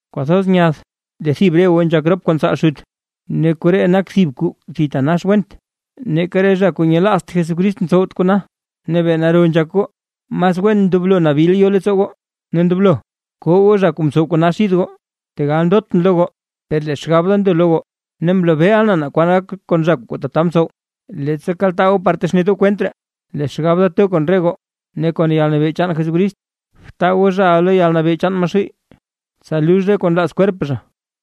Kwathoz nyath lee thib re goo nzhak rop kon tsaal xut. ¡Ne koree nak thib kuu thitanax went, neeka re zha kuu nyelaazt Jesucrist ntsowt kona! ¡Ne bee naro nzhak goo! ¡Mas wen ndoblo nabil yo leettsoo goo, ne ndoblo koo goo zha kuu mtsow kona xid goo! Tegal ndotʼn lo goo per lee xgab da ndo lo goo, ne mlobeeʼa na kwan gak kon zha kuu tata mtsowa. Leettsa kaltaa goo par texnet goo kwent ree, lee xgab da to kon re goo ne kon yalnabee chaan Jesucrist, btaa goo zhaʼa lo yalnabee chaan Maxuuy, tsa lux re kuu nlaaz kwerp zha,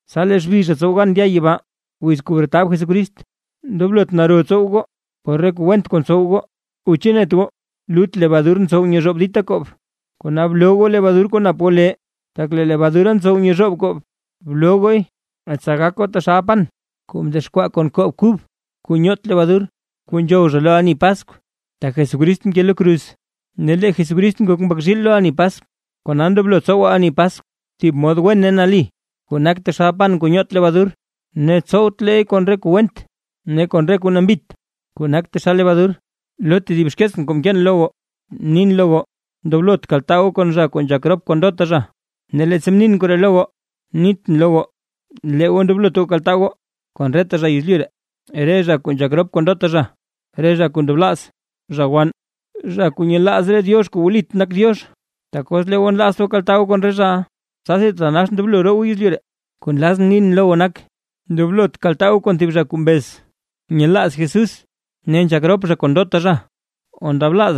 tsa lee xbi zha tsow gan ndya yibaa wiz kuu bretab Jesucrist. Ndoblot naro tsow goo por re kuu went kuu ntsow goo, o ¿chu net goo lut lebadur ntsow nyezhoob dita koob? Kona bloo goo lebadur kuu nap goo lee, tak lee lebadura ntsow nyezhoob koob, bloo gooy tsa gak goo taxal pan kuu mdexkwaa kon koob kub kuu nyoot lebadur, kuu nzhow zha lo ani Paskw. Tak Jesucrist mke lo kruz, ne lee Jesucrist ngok mbak zhiil lo ani Paskw. Kona ndoblo tsowaa ani Paskw, thib mod wen ne nali, kuu nak taxal pan kuu nyoot lebadur, ne tsowtleey kon re kuu went ne kon re kuu nambit, kuu nak taxal lebadur. Lo tedib xkeetsʼn kuu mkeen lo goo, nin lo goo ndoblot kaltaa goo kon zha kuu nzhak rop kon ndota zha. Ne leettsa mnin koree lo goo, nitʼn lo goo lee goo ndoblot kaltaa goo kon reta zha yezlyu ree, re zha kuu nzhak rop kon ndota zha, re zha kuu ndablaaz, zha wann, zha kuu nyelaaz re diox kuu wlit nak Diox, tak os lee goo nlaazt goo kaltaa goo kon re zhaʼa, tsasi thitanax ndoblo roo goo yezlyu ree. Kuu nlazʼn nin lo goo nak: Ndoblot kaltaa goo kon thib zha kuu mbez nyelaaz Jesús ne nzhak rop zha kon ndota zha, zha ndablaaz,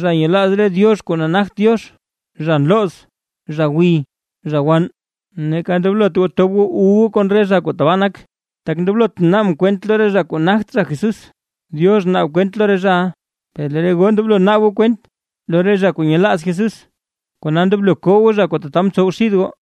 zha nyelaaz re diox kuu nagt Diox, zha nlooz, zha gwiy, zha wann, neeka ndoblot tob goo wu goo kon re zha kuu tabaa nak. Tak ndoblotʼn naabʼn kwent lo re zha kuu nagt zha Jesús, Diox naab kwent lo re zhaʼa. Per lee re goo ndoblo naab goo kwent lo re zha kuu nyelaaz Jesús, kona ndoblo koo goo zha kuu tata ntsowa xid goo.